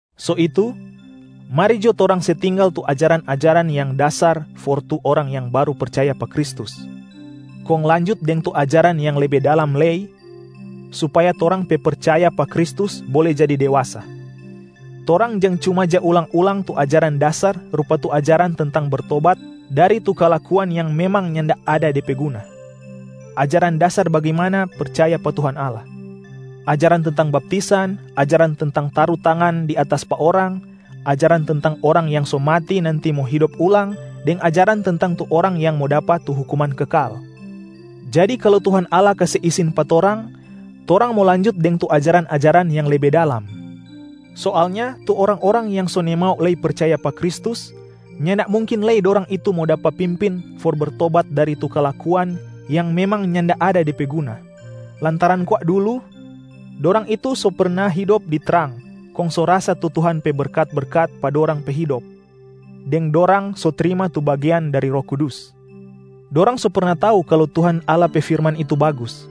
So itu, mari jo torang se tinggal tu ajaran-ajaran yang dasar for tu orang yang baru percaya pa Kristus, kong lanjut deng tu ajaran yang lebe dalam lei supaya torang pe percaya pa Kristus bole jadi dewasa. Torang jang cuma ja ulang-ulang tu ajaran dasar rupa tu ajaran tentang bertobat dari tu kalakuan yang memang nyanda ada de pe guna, ajaran dasar bagimana percaya pa Tuhan Allah, ajaran tentang baptisan, ajaran tentang taru tangan di atas pa orang, ajaran tentang orang yang so mati nanti mo hidop ulang deng ajaran tentang tu orang yang mo dapa tu hukuman kekal. Jadi kalu Tuhan Allah kase isin pa torang, torang mo lanjut deng tu ajaran-ajaran yang lebe dalam. Soalnya tu orang-orang yang so nimau lei percaya pa Kristus, nyanda mungkin lei dorang itu mo dapa pimpin for bertobat dari tu kalakuan yang memang nyanda ada de pe guna, lantaran kwa dulu dorang itu so perna hidop di trang kong so rasa tu Tuhan pe berkat-berkat pa dorang pe hidop, deng dorang so trima tu bagean dari Roh Kudus. Dorang so perna tau kalu Tuhan Allah pe firman itu bagus,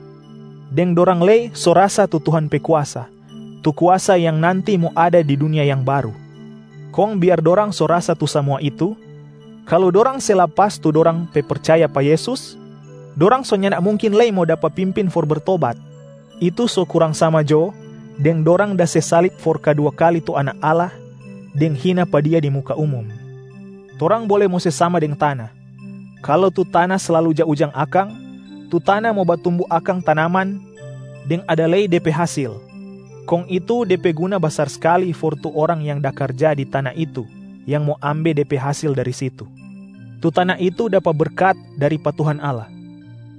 deng dorang lei so rasa tu Tuhan pe kuasa, tu kuasa yang nanti mo ada di dunia yang baru. Kong biar dorang so rasa tu samua itu, kalu dorang se lapas tu dorang pe percaya pa Yesus, dorang so nyanda mungkin lei mo dapa pimpin for bertobat. Itu so kurang sama jo deng dorang da se salib for kadua kali tu Anak Allah deng hina pa Dia di muka umum. Torang bole mo se sama deng tana, kalu tu tana slalu ja ujang akang, tu tana mo batumbu akang tanaman deng ada lei de pe hasil, kong itu de pe guna basar skali for tu orang yang da karja di tana itu yang mo ambe de pe hasil dari situ. Tu tana itu dapa berkat dari pa Tuhan Allah.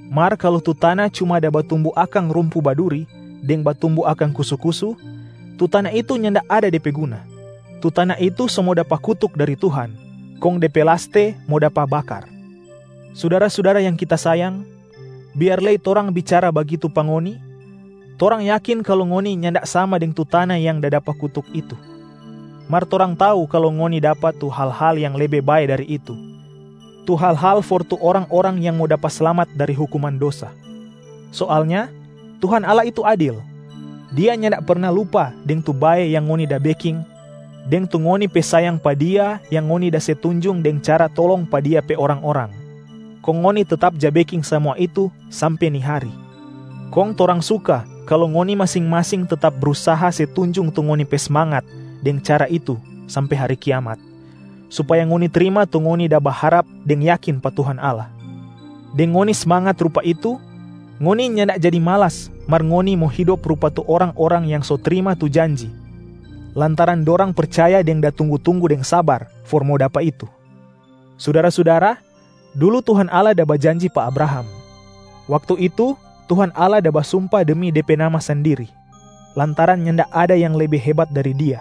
Mar kalu tu tana cuma da batumbu akang rumpu baduri deng batumbu akang kusu-kusu, tu tana itu nyanda ada de pe guna. Tu tana itu so mo dapa kutuk dari Tuhan, kong de pe laste mo dapa bakar. Sudara-sudara yang kita sayang, biar lei torang bicara bagitu pa ngoni, torang yakin kalu ngoni nyanda sama deng tu tana yang da dapa kutuk itu, mar torang tau kalu ngoni dapa tu hal-hal yang lebe bae dari itu, tu hal-hal for tu orang-orang yang mo dapa slamat dari hukuman dosa. Soalnya Tuhan Allah itu adil. Dia nyanda perna lupa deng tu bae yang ngoni da beking deng tu ngoni pe sayang pa Dia yang ngoni da se tunjung deng cara tolong pa Dia pe orang-orang, kong ngoni tetap ja beking samua itu sampe ni hari. Kong torang suka kalu ngoni masing-masing tetap brusaha se tunjung tu ngoni pe smangat deng cara itu sampe hari kiamat, supaya ngoni trima tu ngoni da baharap deng yakin pa Tuhan Allah. Deng ngoni smangat rupa itu, ngoni nyanda jadi malas mar ngoni mo hidop rupa tu orang-orang yang so trima tu janji lantaran dorang percaya deng da tunggu-tunggu deng sabar for mo dapa itu. Sudara-sudara, dulu Tuhan Allah da bajanji pa Abraham. Waktu itu, Tuhan Allah da basumpa demi De pe Nama sandiri, lantaran nyanda ada yang lebe hebat dari Dia.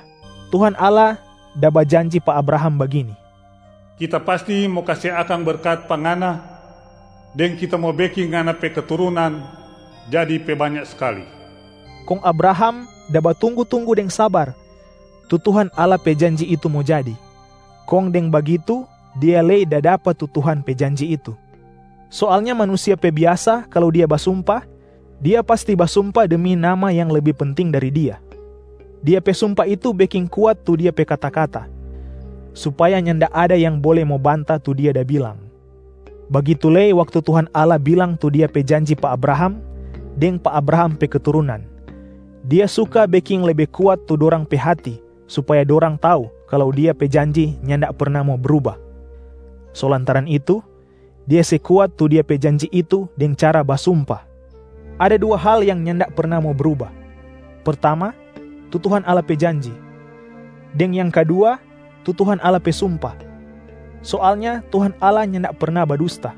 Tuhan Allah da bajanji pa Abraham bagini, “Kita pasti mo kase akang berkat pa ngana deng Kita mo beking ngana pe keturunan jadi pe banya skali.” Kong Abraham da batunggu-tunggu deng sabar tu Tuhan Allah pe janji itu mo jadi, kong deng bagitu dia lei da dapa tu Tuhan pe janji itu. Soalnya manusia pe biasa, kalu dia basumpa, dia pasti basumpa demi nama yang lebe penting dari dia. Dia pe sumpa itu beking kuat tu dia pe kata-kata, supaya nyanda ada yang bole mo banta tu dia da bilang. Bagitu lei waktu Tuhan Allah bilang tu Dia pe janji pa Abraham deng pa Abraham pe keturunan, Dia suka beking lebe kuat tu dorang pe hati supaya dorang tau kalu Dia pe janji nyanda perna mo bruba. So lantaran itu, Dia se kuat tu Dia pe janji itu deng cara basumpa. Ada dua hal yang nyanda perna mo bruba: pertama tu Tuhan Allah pe janji, deng yang kadua tu Tuhan Allah pe sumpa. Soalnya Tuhan Allah nyanda perna badusta.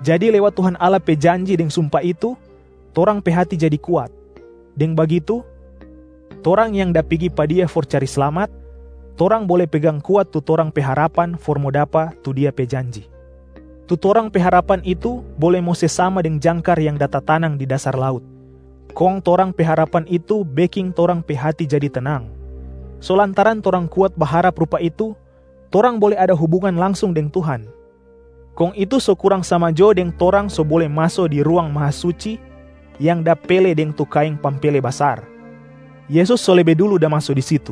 Jadi lewat Tuhan Allah pe janji deng sumpa itu, torang pe hati jadi kuat. Deng bagitu, torang yang da pigi pa Dia for cari slamat, torang bole pegang kuat tu torang pe harapan for mo dapa tu Dia pe janji. Tu torang pe harapan itu bole mo se sama deng jangkar yang da tatanang di dasar laut, kong torang pe harapan itu beking torang pe hati jadi tenang. So lantaran torang kuat baharap rupa itu, torang bole ada hubungan langsung deng Tuhan, kong itu so kurang sama jo deng torang so bole maso di Ruang Mahasuci yang da pele deng tu kaeng pampele basar. Yesus so lebe dulu da maso di situ,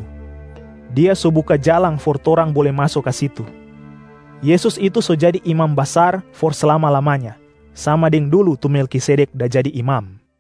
Dia so buka jalang for torang bole maso ka situ. Yesus itu so jadi Imam Basar for slama-lamanya, sama deng dulu tu Melkisedek da jadi imam.